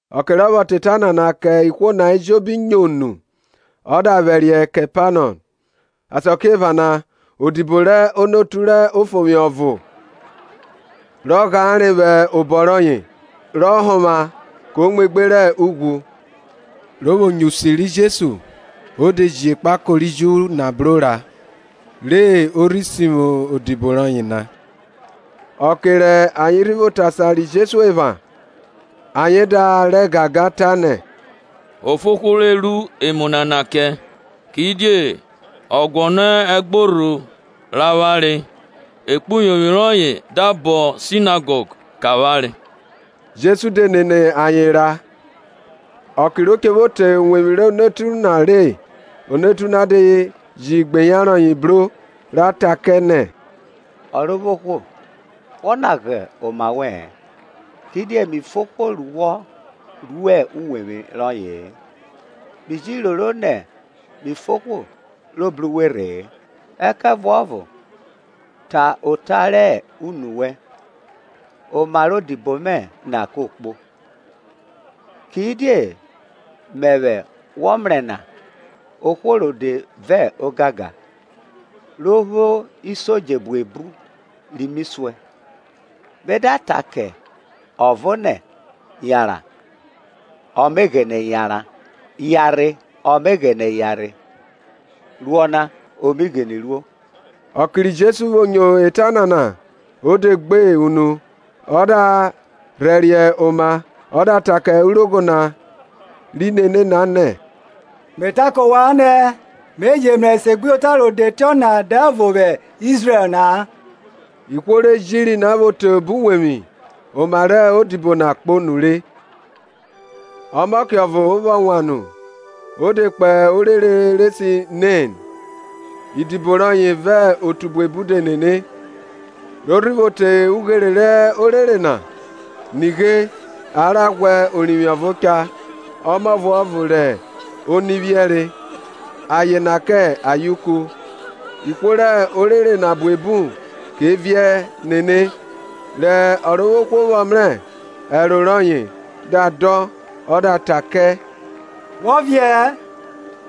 Ọke rọ vwọ ta eta nana kẹ ihwo na ejobi nyo nu, ọ da vwẹriẹ Kepanọm. Asakiephana odibo rẹ onotu rẹ ofovwi ọvo rọ ghare vwẹ obọ rọye, rọ honvwa ko muegbe rẹ ughwu. Ro vwo nyo usi ri Jesu, o de ji ekpako ri Ju na bro ra, re o rhi sivwi odibo rọye na. Ọke rẹ ayen rhi vwo te asan ri Jesu epha, ayen da rẹ gangan, tanẹ, O fo ohwo re ru emu nana kẹ, Kidie ọ guọnọ ẹgborho rẹ avwanre, ekpuyovwi rọye da bọn sinagọg kẹ avwanre. Jesu de nene ayen ra. Ọke ro che vwo te uwevwi rẹ onotu na re, onotu na de ji igbeyan rọye bro, ra ta kẹ nẹ, Ọrovwohwo, wọ lagha oma wẹ-ẹn, kidie mi fo ohwo ru wọ ro uwevwi rọye-e; mi ji roro nẹ mi fo ohwo ro bru uwe rhe-e. Ẹkẹvuọvo ta ota rẹ unu wẹn, oma rẹ odibo mẹ na ko kpo. Kidie mẹvwẹ wọ mrẹ na ohwo rode vẹ ogangan, ro vwo isodje buebu ri mi suẹn. Me da ta kẹ ọvo nẹ, Yanran, ọ me ghene yanran; Yanrhe, ọ me ghene yanrhe; Ru ọna o mi ghini ruo. Ọke ri Jesu vwo nyo eta nana o de gbe unu, ọ da rhẹriẹ oma ọ da ta kẹ urogho na ri nene na nẹ, Me ta kẹ ovwan nẹ, Me je mrẹ esegbuyota rode tiọna dẹvo vwẹ Izrẹl na-a. Ihwo re jiri na vwo te obo uwevwi, oma rẹ odibo na kpo nure. Ọmọke ọvo vwọ wan nu o de kpo orere re se Nen, idibo rọye vẹ otu buebu de nene. Ro rhi vwo te ughere rẹ orere na, nighe, a ra ghwa orivwi ọvo cha, ọmọ ọvuọvo rẹ oni vwiẹri, aye na kẹ ayeuku; ihwo rẹ orere na buebu ke viẹ nene. Rẹ Ọrovwohwo vwọ mrẹ, ẹro rọye da dọn ọ da ta kẹ, Wọ viẹẹ.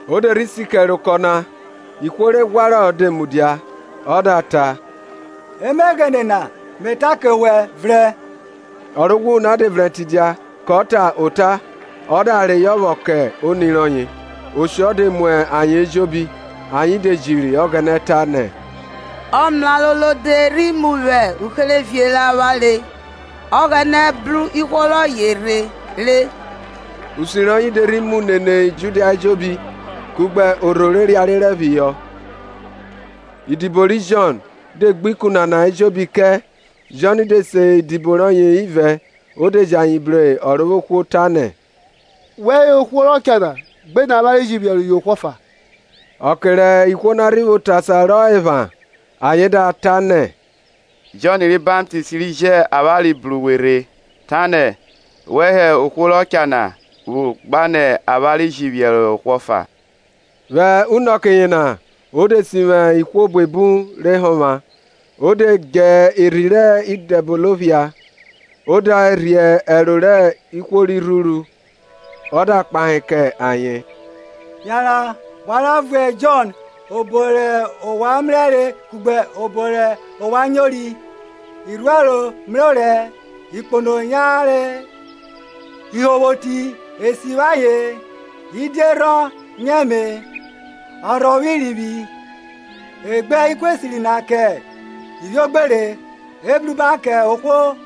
O de rhi si kẹre okọ na, ihwo re ghwarọ de mudia. Ọ da ta, Emeghene na, Me ta kẹ wẹ, vrẹn, Ọ ro ghwuru na de vrẹn tidia, kọ ta ota. O da reyọ vwọ kẹ oni rọye. Oshọ de mu ayen ejobi; ayen de jiri Ọghẹnẹ, tanẹ, Ọmraro rode rhi mu vwẹ uherevie rẹ avwanre, Ọghẹnẹ bru ihwo rọye rhe re! Usi rọye de rhi mu nene Judia ejobi, kugbe orho re riarierẹ phihọ. Idibo ri Jọn de gbe ikun nana ejobi kẹ. Jọn de se idibo rọye ivẹ, o de ji ayen bru Ọrovwohwo, tanẹ, Wẹ hẹ ohwo rọ cha na gbinẹ avwanre ji phiẹrohọ ohwo ọfa? Ọke rẹ ihwo na rhi vwo te asan rọ epha, ayen da ta nẹ, Jọn ri Baptist ri ji avwanre bru we rhe, tanẹ, Wẹ hẹ ohwo rọ cha na vwo, gbinẹ avwanre ji phiẹrohọ ohwo ọfa? Vwẹ unọke yena o de sivwi ihwo buebu re honvwa, ọ da dje irhi rẹ Idẹbono phia, o de rhie ẹro rẹ ihwo ri rhuru. Ọ da kpahe kẹ ayen, Yanran wa ra vuẹ Jọn obo rẹ ovwan mrẹre kugbe obo rẹ ovwan nyori. irhuẹro mrẹ orẹ, ikpono yanre, ihunvwoti e sivwi ayen, idierhọn nyẹme, a rhọvwọ irivwi, e gbe ikun esiri na ke ivwiogbere. Ebruba kẹ ohwo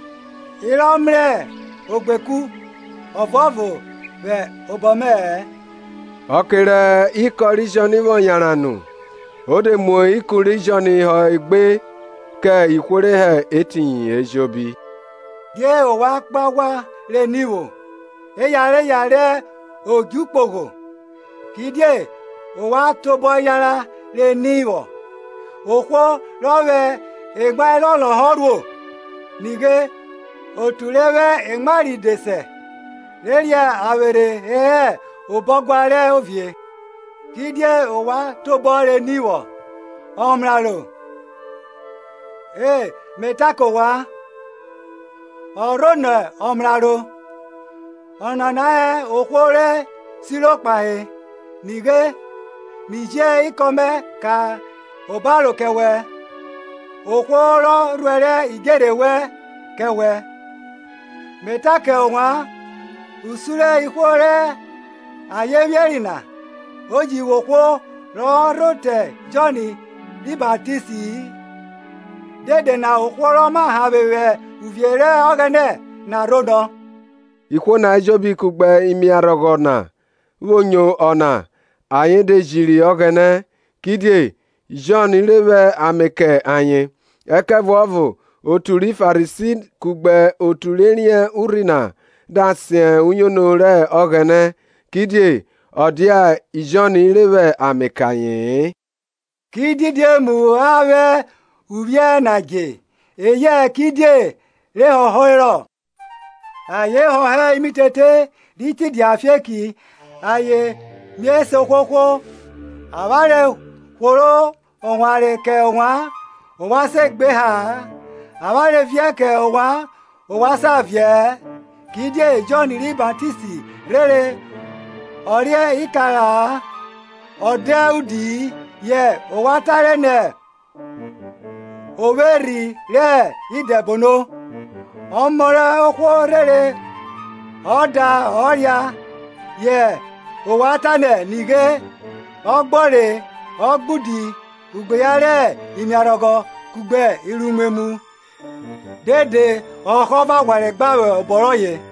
yena rọ mrẹ ogbeku ọvuọvo vwẹ obọ mẹ-ẹ. Ọke rẹ ikọn ri Jọn vwọ yanran nu, o de mu ikun ri Jọn họ e gbe kẹ ihwo re hẹ etiyin ejobi. Die ovwan kpo aghwa re ni vwo? Eyareya rẹ odju kpogho? Kidie ovwan tobọ yanran re ni vwọ? Ohwo rọ vwẹ emwa elọlọhọ rhuo? Nighe, otu re vwẹ emwa ride sẹ re ria avwerhe e hẹ obo ọguan rẹ ovie. Kidie ovwan tobọ re ni vwọ? Ọmraro? E, Me ta kẹ ovwan, ọ rhonọ ọmraro. Ọnana hẹ ohwo re siro kpahe, Nighe, Mi ji ikọn mẹ ka obaro kẹ wẹ, Ohwo rọ rhuẹrẹ idjerhe wẹn kẹ wẹ. Me ta kẹ ovwan, Usun rẹ ihwo rẹ aye vwiẹri na, o ji vwo ohwo rọ rho te Jọn ri Baptisti-i; dede na ohwo rọ ma hanvwe vwẹ uvie rẹ Ọghẹnẹ na rhonọ. Ihwo na ejobi kugbe imiarhọgho na vwo nyo ọna, ayen de jiri Ọghẹnẹ, kidie Jọn re vwẹ ame kẹ ayen; ẹkẹvuọvo otu ri Farisi kugbe otu re riẹn urhi na da sen uyono rẹ Ọghẹnẹ, kidie ọ dia Jọn re vwẹ ame kẹ aye-en. Ki didi emu a vwẹ uvwiẹ na dje, eyẹ kidie re họherọ? Ayen họhọ imitete ri tidia afieki ayen mie se ohwohwo, Avwanre hworo owanre kẹ ovwan, ovwan se gbe eha-a; avwanre viẹ kẹ ovwan, ovwan sa viẹ-ẹ. Kidie Jọn ri Baptist rhere ọ re ikara-a ọ da udi-i; yẹ ovwan tare nẹ, O vwo erhi rẹ idẹbono. Ọmọ rẹ ohwo rhere ọ da ọ ria; yẹ ovwan tanẹ, Nighe, ọgbọre ogbaudi, ugbeyan rẹ imiarhọghọ kugbe irnimwemwu! Dede ọhọ vẹ aghwanre gbare vwẹ obọ rọye.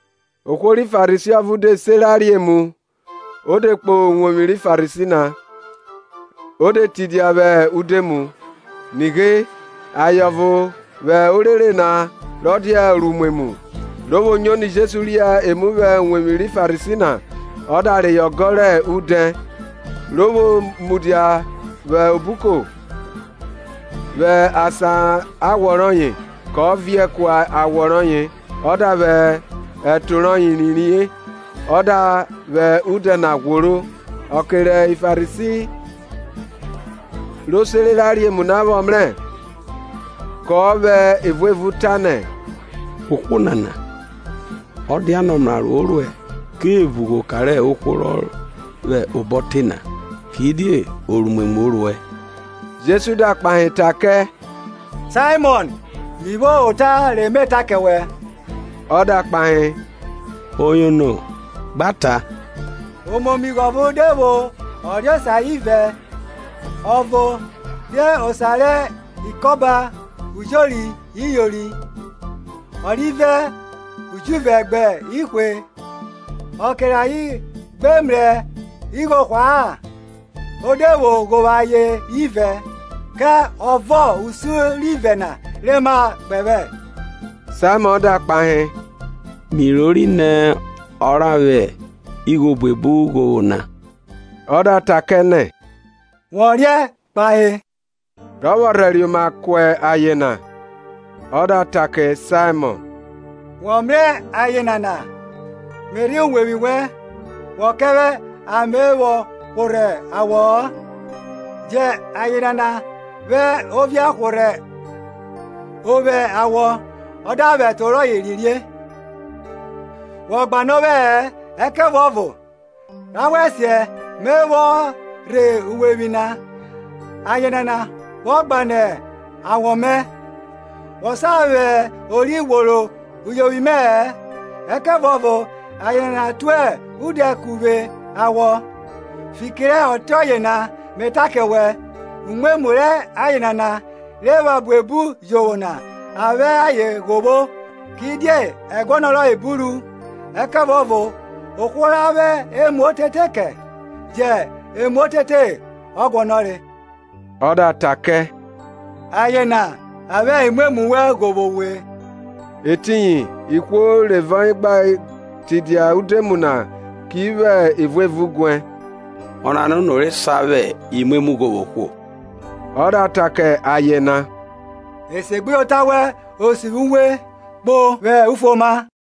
Ohwo ri Farisi ọvo de se ra re emu, o de kpo uwevwi ri Farisi na, o de tidia vwẹ udoemu. Nighe aye ọvo vwẹ orere na, rọ dia oruimwemwu, ro vwo nyo nẹ Jesu ria emu vwẹ uwevwi ri Farisi na, ọ da reyọ ọgọ rẹ udẹ; ro vwo mudia vwẹ obuko vwẹ asan awọ rọye, kọ viẹ ku awọ rọye ọ da vwẹ ẹto rẹ uyovwi rọye rhie, ọ da vwẹ udẹ na ghworo. Ọke ri Farisi ro sere ra re emu na vwọ mrẹ, kọ vwẹ evuevun tanẹ, Ohwo nana, ọ dianẹ ọmraro o ruẹ, ke vugbe, oka rẹ ohwo rọ vwẹ obọ te na, kidie oruimwemwu o ruẹ. Jesu da kpahe ta kẹ, Saimọn, Mi vwo ota re me ta kẹ wẹ. Ọ da kpahe, Oyono, gba ta. Omomigho ọvo de vwo ọreosa ivẹ; Ọvo re osa rẹ ikoba ujori iyori, ọrivẹ ujuvẹ gbẹ ihwe. Ọke rẹ ayen gbe mrẹ igho hwa-a, o de vwo ghovwo ayen ivẹ. Ke ọvo usun rẹ ivẹ na re ma kpẹvwẹ? Saimọn da kpahe, Mi rori nẹ ọ ra vwẹ igho obuebu ghovwo na. Ọ da ta kẹ nẹ, wọ riẹn kpahe. Ro vwo rhẹriẹ oma ku aye na, Ọ da ta kẹ Saimọn, Wọ mrẹ aye nana? Me rhe uwevwi wẹn, wọ kẹ vwẹ ame vwọ hworhẹ awọ-ọ; jẹ aye nana vwẹ ovie hworhẹ ovwẹ awọ, ọ da vwẹ ẹto rọye rhie. Wo gbane ovwẹ-ẹ; ẹkẹvuọvo rhawẹsiẹ Me vwọ rhe uwevwi na, aye nana vwọ gbane awọ mẹ. Wo sa vwẹ ori ghworo uyovwi mẹ-ẹ; ẹkẹvuọvo aye nana tue udẹ ku vwe awọ. Fiki rẹ ọtiọye na Me ta kẹ wẹ, Umwemwu rẹ aye nana, rọ epha buebu jovwo na, a vwẹ ayen ghovwo; kidie ẹguọnọ rọye buru; ẹkẹvuọvo ohwo ra vwẹ emu otete kẹ, jẹ emu otete ọ guọnọre. Ọ da ta kẹ, Aye na a vwẹ imwemwu wẹn ghovwo uwe. Etiyin ihwo re vẹ ọye gbe tidia udoemu na, ke vwẹ evuevun guẹ, Ọnana ono rọ sa vwẹ imwemwu ghovwo ohwo? Ọ da ta kẹ aye na, Esegbuyota wẹn o sivwi uwe; kpo vwẹ ufuoma.